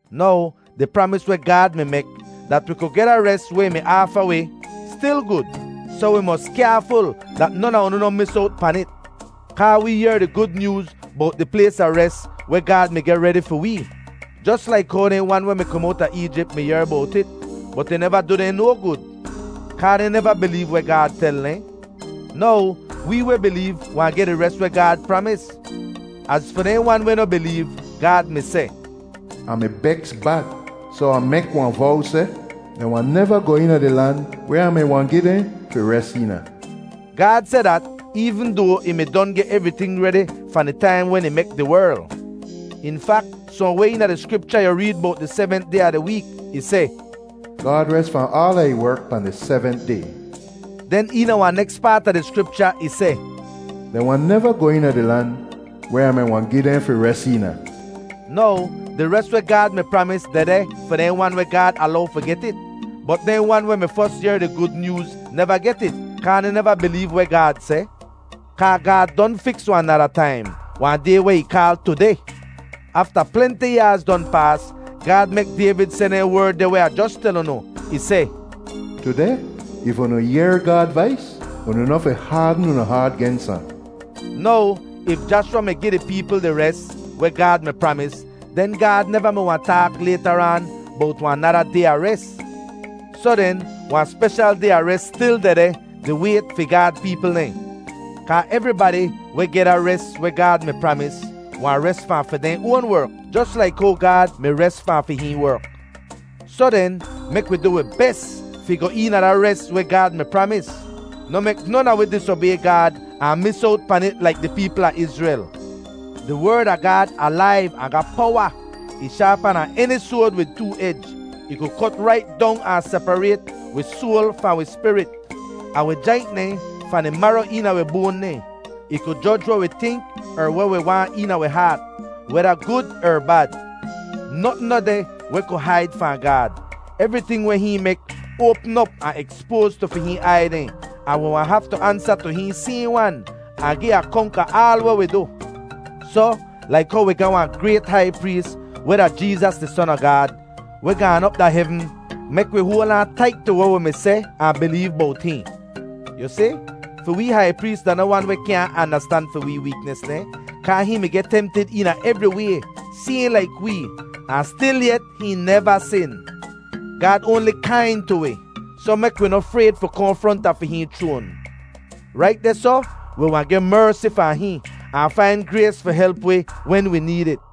Now, di pramis weh Gaad mi mek dat wi ku geh da res weh ih mi aafa wi stil gud, soh wi mos kyaaful dat non a unu noh mis owt pan it. Kaa wee yehr di Gud Nyooz bowt di plays a res weh Gaad mi geh redi fi wee, jos laik how dehn wan weh mi kom owta Eejip mi yehr bowt it; bot ih neva du dehn no gud, kaa dehn neva bileev weh Gaad tel dehn. Now, wee weh bileev wahn geh di res weh Gaad pramis. Az fi dehn wan weh noh bileev, Gaad mi seh, “Ah mi beks bad, soh Ah mek wahn vow seh, ‘Dehn wahn neva goh eena di lan weh Ah mi wahn gi dehn fi res eena’” Gaad seh dat, eevn doa ih mi don geh evriting redi fahn di taim wen ih mek di werl. In fak, sohnweh eena di Skripcha yu reed bowt di sevent day a di week. Ih seh, “Gaad res fahn aala ih werk pahn di sevent day.” Den eena wahn neks paat a di Skripcha ih seh, “Dehn wahn neva goh eena di lan weh Ah mi wahn gi dehn fi res eena.” Now, di res weh Gaad mi pramis dehdeh fi dehn wan weh Gaad alow fi get it. Bot dehn wan weh mi fos yehr di Gud Nyooz neva get it, kaa dehn neva bileev weh Gaad seh. Kaa Gaad don fiks wahn nada taim, wahn day weh ih kaal “tudeh.” Afta plenti yaaz don paas, Gaad mek Dayvid seh dehn werd deh weh Ah jos tel unu. Ih seh, “Tudeh if unu yehr Gaad vais, unu noh fi haadn unu haat gens ahn.” Now, if Jashwa mi gi di peepl di res weh Gaad mi pramis, den Gaad neva mi wahn taak laytaraan bowt wahn nada day a res. Soh den, wahn speshal day a res stil dehdeh di wayt fi Gaad peepl dehn; kaa evribadi weh geh da res weh Gaad mi pramis wahn res fahn fi dehn oan werk, jos laik how Gaad mi res fahn fi hihn werk. Soh den, mek wi du wi bes fi goh eena da res weh Gaad mi pramis; noh mek non a wi disobay Gaad ahn mis owt pan it laik di peepl a Izrel. Di Werd a Gaad alaiv ahn ga powa! Ih shaapa dahn eni soad wid too ej. Ih ku kot rait dong ahn separayt wi soal fahn wi spirit, ahn wi jaint dehn fahn di maro eena wi boan dehn. Ih ku joj weh wi tink er weh wi waahn eena wi haat, weda gud er bad. Notn noh deh weh ku haid fahn Gaad. Evriting weh hihn mek oapm op ahn ekspoaz tu fi hihn aiy dehn, ahn wi wahn haftu ansa tu hihn sayhn wan, ahn gi akonk a aal weh wi du. Soh, laik how wi ga wahn grayt hai prees, weh da Jeezas di Son a Gaad, weh gaan op da hevn, mek wi hoal aan tait tu weh wi mi seh ahn bileev bowt hihn. Yu si, fi wee hai prees da noh wan weh kyaahn andastan fi wee weeknis dehn, kaa hihn mi geh temtid eena evri way, sayhn laik wee, ahn stilyet hihn neva sin. Gaad oanli kain tu wi, soh mek wi noh frayd fi kohn fronta fi hihn chroan. Rait dehsoh wi wahn geh mersi fahn hihn, ahn fain grays fi help wi wen wi need it.